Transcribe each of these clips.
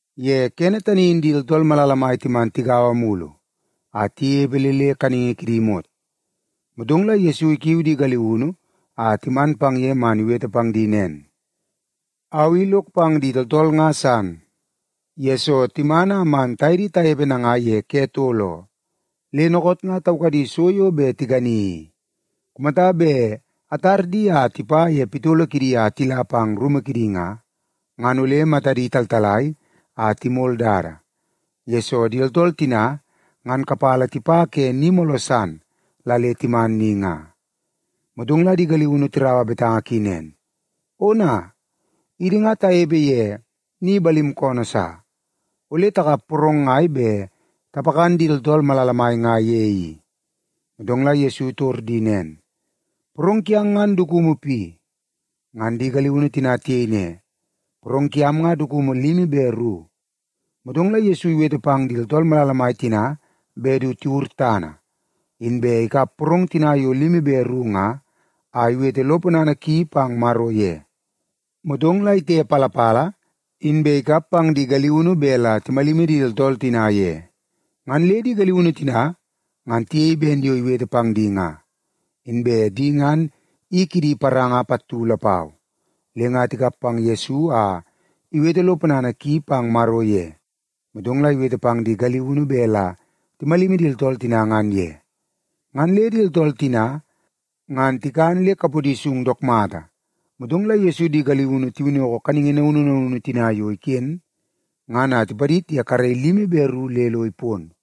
Ye kene tani in di tooltool malala mai timan tigaua mulu a tinepe le le kaningi kidi imot, motong la Yesu ikiu di galiunu a timan pang ye man iwete pang di nen, “Au i lok pang di tooltool nga san, yesoo timan a man taye di tanepe nanga ye ke tol oo, le dookoot nga taukadi so yo bet tikani i. Kumata bet atar di a tipa ye pitolo kidi a tila pang rumu kidi nga, ngan ole matadi taltalai a timol dada, yesoo di tooltool tina ngan kapala tipa ke ni mooloo san la le timan ni nga.” Motong la di galiunu tiraua betanga ki nen, “Ona, idi nga tanepe ye ni balim koonoo sa! Ole takap porong ngai bet tapakan di tooltool malala mai nga ye i?” Motong la Yesu itor di nen, “Porong kiang ngan dukumu pi?” Ngan di galiunu tina tiyei ne, “Porong kiam nga dukumu limi be ru.” Motong la Yesu iwete pang di tooltool malala mai tina bet du tiwur tana. Inbe ikap porong tina yo limi be ru nga, a iwete lo ponana ki pang Maro ye. Motong la itepalapala, inbe ikap pang di galiunu bet la timalimi di tooltool tina ye. Ngan le di galiunu tina ngan tiyei ben yo iwete pang di nga. Inbe di ngan i kidi paranga pattu lapau, le nga tikap pang Yesu a iwete lo ponana ki pang Maro ye. Motong la iwete pang di galiunu bet la timalimi di tooltool tina ngan ye. Ngan le di tooltool tina ngan tikan le kapodi sung dook mata. Motong la Yesu di galiunu tiwinnoko kaningi naunu naunu tina yo iken nga, ngan a tipadid ye karei limi be ru le lo ipon.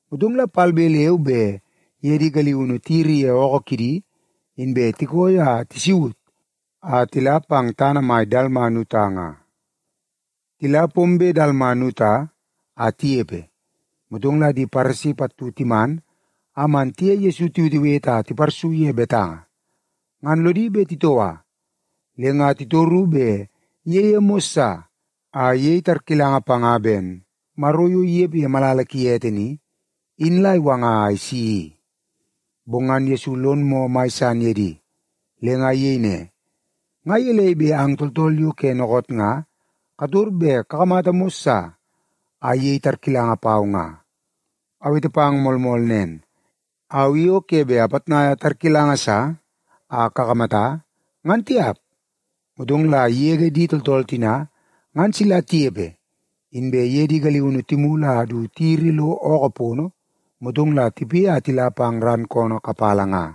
Motong la palbe leu be iye di galiunu tiyiri ye ookoo kidi, inbe tikooi a tisaut a tila pang tana mai Dalmanuta nga. Tila pombe Dalmanuta a tinepe, motong la di Paresi pattu timan a man tiye Yesu tiwetewete a tiparsu ye betanga. Ngan lodi bet titoua, le nga titoru bet iyeie mos sa a iyei tarkilanga panga ben Maro yo inepe ye malala ki ete ni, in la iwanga a isi i. Bong ngan Yesu lon moo mai san ye di. Le nga iyei ne, “Nga gelei bet ang tooltool yo ke dookoot nga kator bet kakamata mos sa a iyei tarkilanga pau nga? Awete pang moolmool nen, au i o ke bet apitnaia tarkilanga sa a kakamata, ngan tiap.” Motong la igege di tooltool tina ngan sila tinepe, inbe iye di galiunu timulu a du tiyiri lo ookoo pono, motong la tipoi a tila pang ran koonoo kapala nga.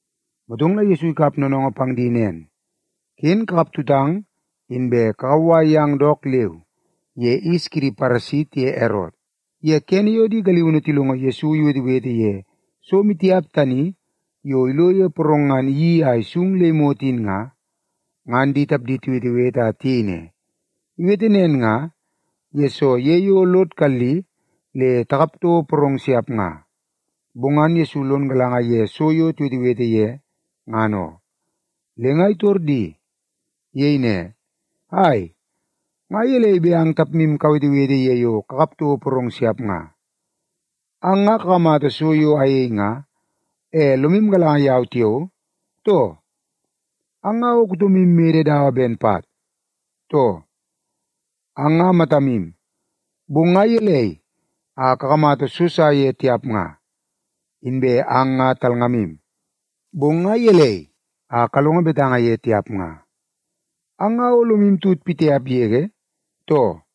Motong la Yesu ikap noonoongoo pang di nen, “Ken kakap tutang, inbe kakauwai yang dook leu ye yis kidi Paresi tiye Erot.” Ye kene yo di galiunu tilongo Yesu iwetewete ye so maitiap tani yo ilo ye porong ngan iyeii a isung le imot in nga, ngan di tapdi tiwetewete a tiyei ne, “Iwete nen nga, yesoo ye yo lod kalli le takap toko porong siap nga.” Bong ngan Yesu lon galanga ye so yo tiwetewete ye ngan oo, le nga itor di. Iyei ne, “Ai, nga gelei bet ang tapmu kawetewete ye yo kakap toko porong siap nga? Ang nga kakamata so yo ayei nga, e lomu galanga yau tiao, too? Ang nga o kutomu mede mata dawa ben pat, too? Ang nga matamu, bong nga gelei a kakamata so sa ye tiap nga? Inbe ang nga talngamu, bong nga gelei a kalongo betanga ye tiap nga? Ang nga o lomu tut pitiap yege, too?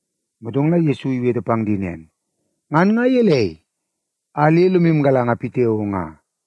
Motong la Yesu iwete pang di nen, “Ngan nga gelei a le lomu galanga pitiao nga?”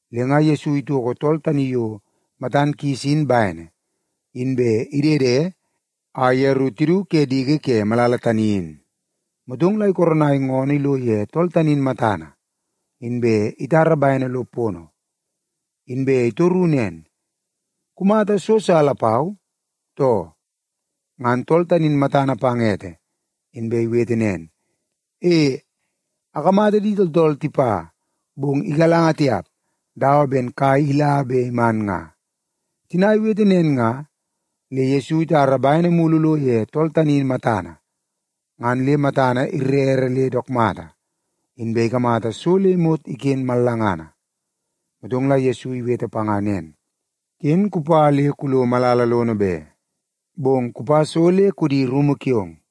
Le nga Yesu itoko tool tani yo matan kis in bene, inbe idede a yeru tidu ke diki ke malala tani in. Motong la ikoronai ngoonoo ilo ye tool tani in matana, inbe itara bene lo pono. Inbe itoru nen, “Kumata so sa lapau, too?” Ngan tool tani in matana pang ete, inbe iwete nen, “E, akamata di tooltool tipa, bong igalanga tiap, dawa ben kai ila be iman nga.” Tina iwete nen nga, le Yesu itara bene mulu lo ye tool tani in matana. Ngan le matana irere le dook mata, inbe ikamata so le imot iken mallangana. Motong la Yesu iwete panga nen, “Ken kupa le kulo malala lono be, bong kupa so le kudi rumu kiong.”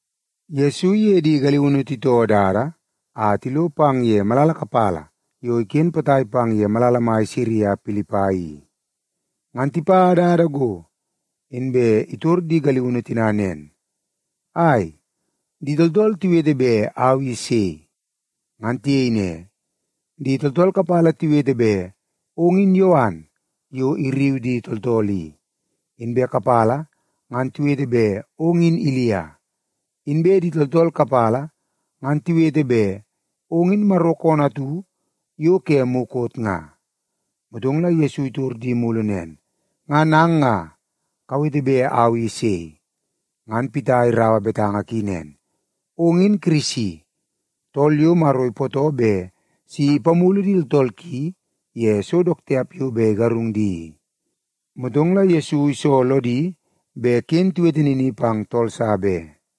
Yesu iye di galiunu titoo dada a tilo pang ye malala kapala yo iken potai pang ye malala mai Sisaria Pilipai i. Ngan tipa dada go, inbe itor di galiunu tina nen, “Ai, di tooltool tiwete bet au i sei?” Ngan tiyei ne, “Di tooltool kapala tiwete bet ong in Yowan yo irriu di tooltool i, inbe kapala ngan tiwete bet ong in Ilia. Inbe di tooltool kapala ngan tiwete bet ong in Maro koonoo atu yo ke mukot nga.” Motong la Yesu itor di mulu nen, “Ngan ang nga, kawete bet au i sei?” Ngan Pita iraua betanga ki nen, “Ong in Kirisi, tool yo Maro ipootoo bet si ipamulu di tooltool ki ye so dook tiap yo bet igarung di i.” Motong la Yesu iso lodi bet ken tiwete nini pang tool sa be.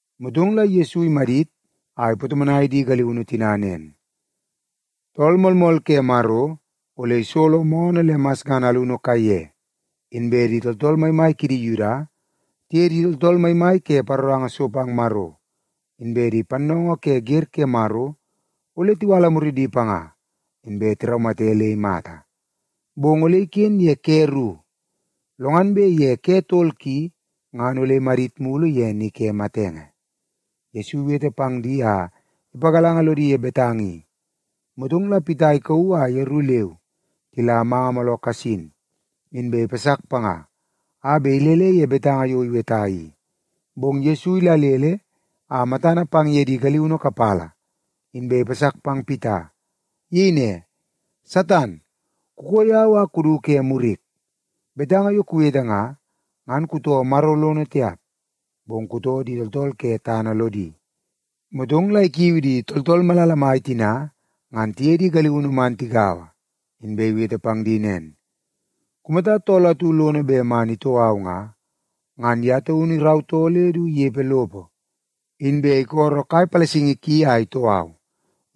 Motong la Yesu imadit a ipatomonai di galiunu tina nen, “Tool Moolmool Ke Maro ole isolo moonoo le masngana alunu kaiye. Inbe di tooltool maimai kidi Yuda tiye di tooltool maimai ke paroranga so pang Maro, inbe di pannoongoo ke wer ke Maro ole tiwala muridi panga inbe tiraumate le imata. Bong ole iken ye ke ru, lo ngan bet ye tol ki ngan ole imadit mulu ye ni ke matenge.” Yesu iwete pang di a ipagalanga lodi ye betanga i, motong la Pita ikauu a yeru leu tila manga mooloo kasin, inbe ipasak panga a bet ilele ye betanga yo iweta i. Bong Yesu idalele a matana pang ye di galiunu kapala, inbe ipasak pang Pita. Iyei ne, “Satan, kukoo yau a kudu ke murik. Betanga yo kuwete nga, ngan kutoo Maro lono tiap, bong kutoo di tooltool ke tana lodi.” Motong la ikiu di tooltool malala mai tina ngan tiye di galiunu man tigaua, inbe iwete pang di nen, “Kumata tool atu lono bet man itoo au nga, ngan ye taunu irautoo le du inepe lopo, inbe isolo kai palasingi ki a itoo au.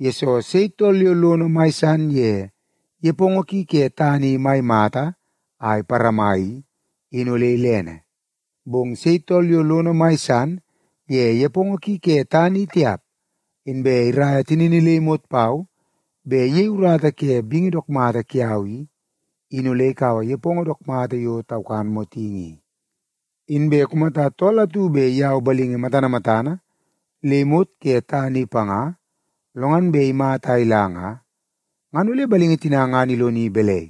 Yesoo, sei tool yo lono mai san ye nepongo ki ke tana i mai mata a iparama i, in ole ilene. Bong sei tool yo lono mai san ye nepongo ki ke tana i tiap, inbe iraia tinini le imot pau bet iyei urata ke bingi dook mata kiau i, in ole ikaua nepongo dook mata yo taukan motingi i. Inbe kumata tool atu bet iyau balingi matana matana le imot ke tana i panga, lo ngan bet imata a ila nga, ngan ole balingi tina ngan iloni balai?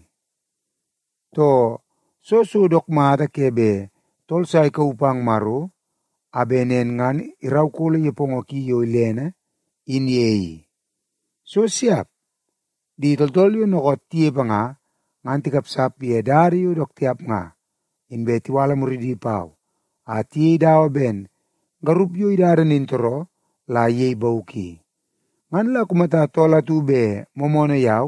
Too, soo so dook mata ke bet tool sa ikauu pang Maro a bet nen ngan iraukolo nepongo ki yo ilene in ye i? So siap! Di tooltool yo dookoot tinepe nga, ngan tikapsap ye dada yo dook tiap nga, inbe tiwala muridi pau a tiyei dawa ben garup yo idada nintooroo la iyei bauk i. Ngan la kumata tool atu bet moomoonoo yau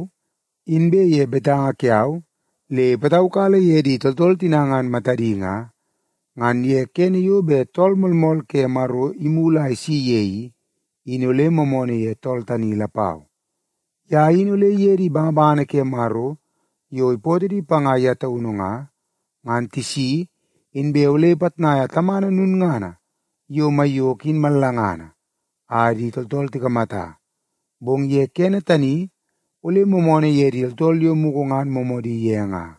inbe ye betanga kiau le ipataukala ye di tooltool tina ngan matadi nga, ngan ye kene yo bet Tool Moolmool ke Maro imulu a isi ye i, in ole moomoonoo ye tool tani lapau. Ye in ole iye di bangabangana ke Maro yo ipootoo di panga ye taunu nga, ngan tisi inbe ole ipitnaia Tamana lulngana yo maiyoko in mallangana a di tooltool tikamata, bong ye kene tani ole moomoonoo ye di tooltool yo mugu ngan moomoodi ye nga.”